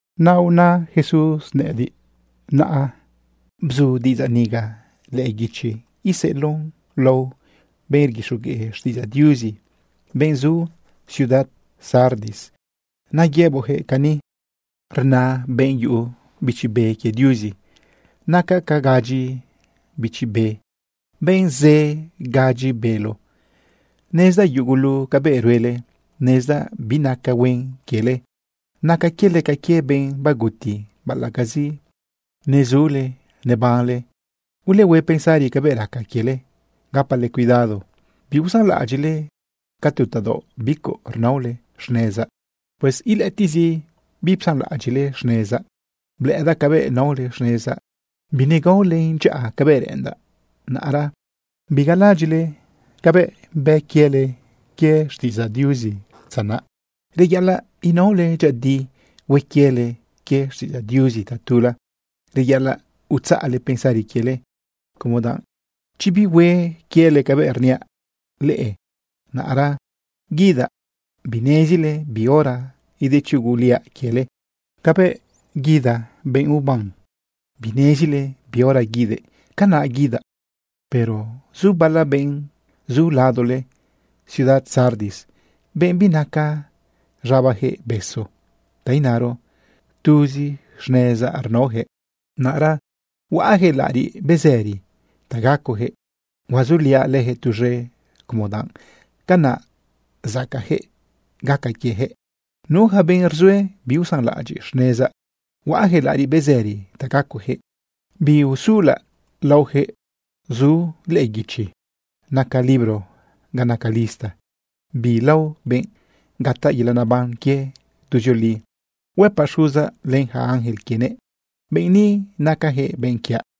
Naꞌra una Jesús gudyinëꞌ nëꞌëdiꞌ: ―Naꞌra bzu diꞌidzaꞌ niga lëꞌë guichi iseꞌeloꞌn lao benꞌ rguixogueꞌ xtiꞌidzaꞌ Diuzi, benꞌ zu ciudad Sardis. Naꞌ yëboꞌjëꞌ: “Cani rna benꞌ yuꞌu Bichi Be quie Diuzi naca ca gadyi bichi be, benꞌ zë gadyi bélo: Nezdaꞌ yugulu cabëꞌ ruele. Nezdaꞌ binaca huen quiele, naca quiele ca quie benꞌ baguti baꞌalaꞌcazi nezule nebanle. Ulehue pensari cabëꞌ raca quiele. Gapale cuidado biusanlaꞌadyiꞌle ca tu tadaoꞌ bicuꞌ rnaole xnezaꞌ. Pues ilëꞌëtiꞌzi bipsanlaꞌadyiꞌle xnezaꞌ. Blëꞌëdaꞌ cabëꞌ naole xnezaꞌ, binegaolen dyaꞌa cabëꞌ reꞌendaꞌ. Naꞌra bigalaꞌadyiꞌle cabëꞌ bë quiele quie xtiꞌidzaꞌ Diuzi dza naꞌ. Reyaꞌalaꞌ inaole dyëꞌëdi hue quiele quie xtiꞌidzaꞌ Diuzi tatula. Reyaꞌalaꞌ utzaꞌle pensari quiele, como danꞌ chi bihue quiele cabëꞌ rniaꞌ leꞌe, naꞌra guidaꞌ binezile bi hora idechuguliaꞌ quiele. Cabëꞌ guida benꞌ uban, binezile bi hora guidëꞌ, canaꞌ guidaꞌ. Pero zu bala benꞌ zu ladole ciudad Sardis, benꞌ binaca z̃abajëꞌ besu, ta inaro, tuzi xnezaꞌ rnaojëꞌ. Naꞌra huaꞌjëꞌ laꞌariꞌ bezëri ta gacojëꞌ, huazuliaꞌ lëjëꞌ tuz̃e, como danꞌ canaꞌ zacaꞌjëꞌ gaca quiejëꞌ. Nu yaca benꞌ rzue biusanlaꞌadyiꞌ xnezaꞌ, huaꞌjëꞌ laꞌariꞌ bezëri ta gacojëꞌ, biusulaꞌ laojëꞌ zu lëꞌë guichi naca libro ga naca lista bi lao benꞌ gataꞌ yelaꞌ neban quie tuzioli. Huëpaꞌ Xuzaꞌ len yaca ángel quienëꞌ: “Benꞌ ni nacajëꞌ benꞌ quiaꞌ.”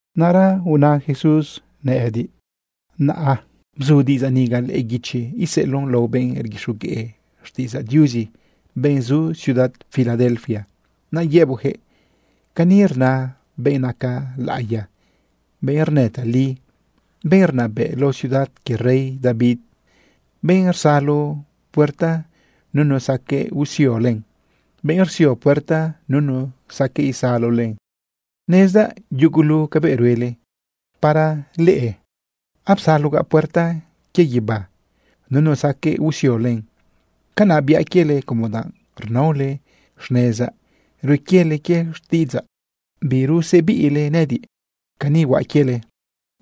Naꞌra una Jesús gudyinëꞌ nëꞌëdiꞌ: ―Naꞌra bzu diꞌidzaꞌ niga lëꞌë guichi iseꞌeloꞌn lao benꞌ rguixogueꞌ xtiꞌidzaꞌ Diuzi, benꞌ zu ciudad Filadelfia. Naꞌ yëboꞌjëꞌ: “Cani rna benꞌ naca laꞌiya, benꞌ rnë tali, benꞌ rnabëꞌ lao ciudad quie rey David, benꞌ rsalo puerta nunu saqueꞌ usio len, benꞌ rsio puerta nunu saqueꞌ isalo len: Nezdaꞌ yugulu cabëꞌ ruele. Para leꞌe apsalogaꞌ puerta quie guibá, nunu saqueꞌ usio len. Canaꞌ biaꞌ quiele como danꞌ rnaole xnezaꞌ, rue quiele quie xtiꞌidzaꞌ, birusebiꞌle nëꞌëdiꞌ. Cani huaꞌ quiele: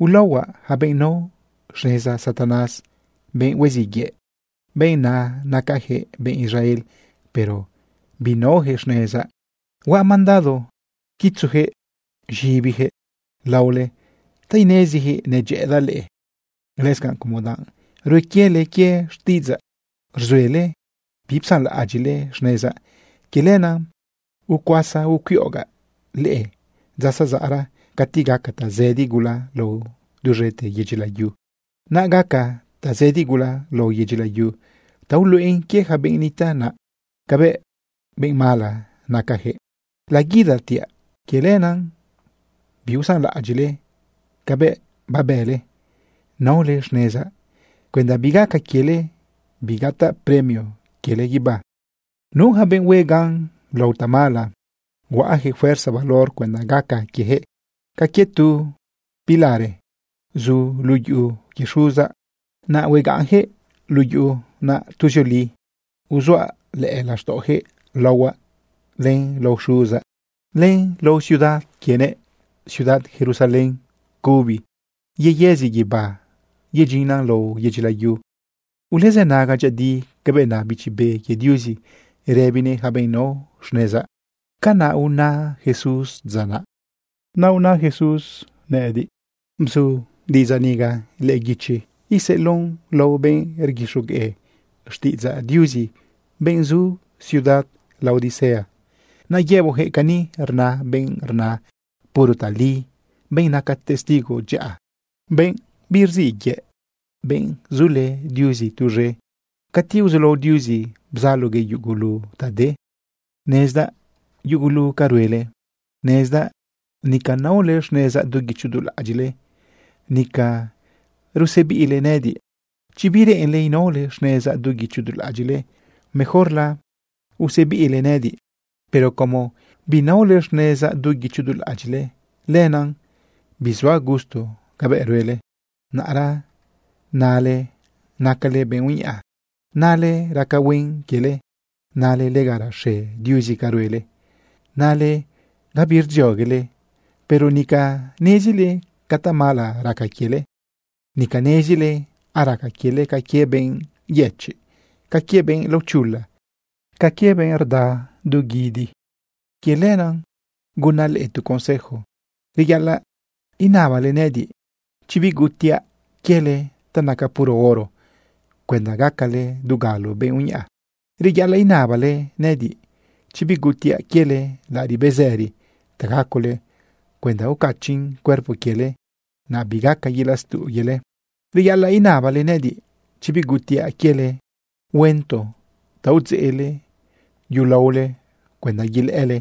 Ulaohuaꞌ yaca benꞌ nao xneza Satanás, benꞌ huiziꞌ yëꞌ, benꞌ na nacajëꞌ benꞌ Israel, pero binaojëꞌ xnezaꞌ. Huaꞌ mandado quitzujëꞌ z̃ibijëꞌ laole ta inezijëꞌ nedyëꞌëdaꞌ leꞌe. Lëscanꞌ, como danꞌ rue quiele quie xtiꞌidzaꞌ, rzuele bipsanlaꞌadyiꞌle xnezaꞌ, quie lenaꞌ ucuasa ucuiꞌogaꞌ leꞌe dza zazaꞌra cati gaca tazëdi gula lao duz̃ete yedyi layu. Naꞌ gaca tazëdi gula lao yedyi layu ta uluꞌen quie yaca benꞌ nitaꞌ naꞌ cabëꞌ benꞌ mala nacajëꞌ. Laguidatiaꞌ. Quie lenaꞌ biusanlaꞌadyiꞌle cabëꞌ babële naole xnezaꞌ cuenda bigaca quiele bigataꞌ premio quiele guibá. Nu yaca benꞌ hue gan lao tamala, huaꞌjëꞌ fuerza valor cuenda gaca quiejëꞌ ca quie tu pilare zu luꞌu yuꞌu quie Xuzaꞌ. Naꞌ huegaꞌnjëꞌ luꞌu yuꞌu naꞌ tuzioli. Uzuaꞌ lëꞌë laxtaꞌojëꞌ laohuaꞌ, len lao Xuzaꞌ, len lao ciudad quienëꞌ, ciudad Jerusalén cubi yeyëzi guibá yedyinnan lao yedyi layu. Ulezënaga dyëꞌëdi cabëꞌ na Bichi Be quie Diuzi rëbinëꞌ yaca benꞌ nao xnezaꞌ.” ―Canaꞌ una Jesús dza naꞌ. Naꞌra una Jesús gudyinëꞌ nëꞌëdiꞌ: ―Bzu diꞌidzaꞌ niga lëꞌë guichi iseꞌeloꞌn lao benꞌ rguixogueꞌ xtiꞌidzaꞌ Diuzi, benꞌ zu ciudad Laodicea. Naꞌ yëboꞌjëꞌ: “Cani rna benꞌ rna puro tali, benꞌ naca testigo dyaꞌa, benꞌ birziꞌ yëꞌ, benꞌ zulë Diuzi tuz̃e cati uzulao Diuzi bzaloguëꞌ yugulu ta de: Nezdaꞌ yugulu ca ruele. Nezdaꞌ nica naole xnezaꞌ du guicho du laꞌadyiꞌle, nica rusebiꞌle nëꞌëdiꞌ. Chi bireꞌenle inaole xnezaꞌ du guicho du laꞌadyiꞌle, mejorla usebiꞌle nëꞌëdiꞌ. Pero como binaole xnezaꞌ du guicho du laꞌadyiꞌle, lenaꞌ bizuaꞌ gusto cabëꞌ ruele. Naꞌra nale nacale benꞌ uñaꞌa. Nale raca huen quiele. Nale lega raxe Diuzi ca ruele. Nale gabi rdzioguele. Pero nica nezile ca tamala raca quiele. Nica nezile araca quiele ca quie benꞌ yëchiꞌ, ca quie benꞌ laochula, ca quie benꞌ rda z̃an guidi. Quie lenaꞌ gunaꞌ leꞌe tu consejo. Reyaꞌalaꞌ inabale nëꞌëdiꞌ chi bigutiꞌa quiele ta naca puro oro cuenda gacale dugalo benꞌ uñaꞌa. Reyaꞌalaꞌ inabale nëꞌëdiꞌ chi bigutiꞌa quiele laꞌariꞌ bezëri ta gacole cuenda ucachiꞌn cuerpo quiele, naꞌ bigaca yelaꞌ stuꞌ quiele. Reyaꞌalaꞌ inabale nëꞌëdiꞌ chi bigutiꞌa quiele huento ta udzeꞌle yulaole cuenda yelëꞌële.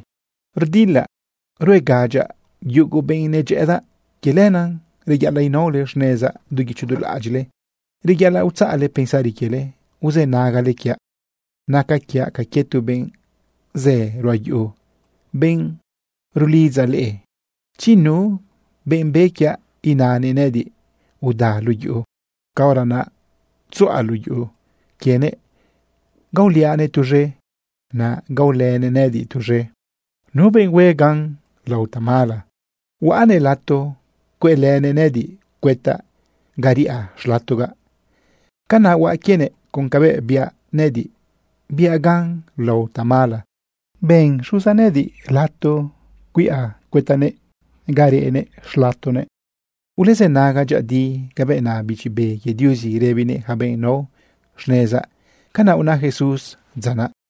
Rdilaꞌ ruegadyaꞌ yugu benꞌ nedyëꞌëdaꞌ. Quie lenaꞌ reyaꞌalaꞌ inaole xnezaꞌ du guicho du laꞌadyiꞌle. Reyaꞌalaꞌ utzaꞌle pensari quiele uzënagale quiaꞌ. Naca quiaꞌ ca quie tu benꞌ zë ruꞌa yuꞌu, benꞌ rulidza leꞌe. Chi nu benꞌ be quiaꞌ inanëꞌ nëꞌëdiꞌ: Uda luꞌu yuꞌu, caora naꞌ tzuꞌa luꞌu yuꞌu quienëꞌ gaoliaꞌnëꞌ tuz̃e, naꞌ gaolënëꞌ nëꞌëdiꞌ tuz̃e. Nu benꞌ hue gan lao tamala, huaꞌnëꞌ lato cueꞌlënëꞌ nëꞌëdiꞌ cuëtaꞌ ga riꞌa xlatogaꞌ. Canaꞌ huaꞌ quienëꞌ con cabëꞌ biaꞌ nëꞌëdiꞌ, biaꞌ gan lao tamala, ben Xuzaꞌ nëꞌëdiꞌ lato cuiꞌa cuëtaꞌnëꞌ ga reꞌnëꞌ xlatonëꞌ. Ulezënaga dyëꞌëdi cabëꞌ na Bichi Be quie Diuzi rëbinëꞌ yaca benꞌ nao xnezaꞌ.” ―Canaꞌ una Jesús dza naꞌ.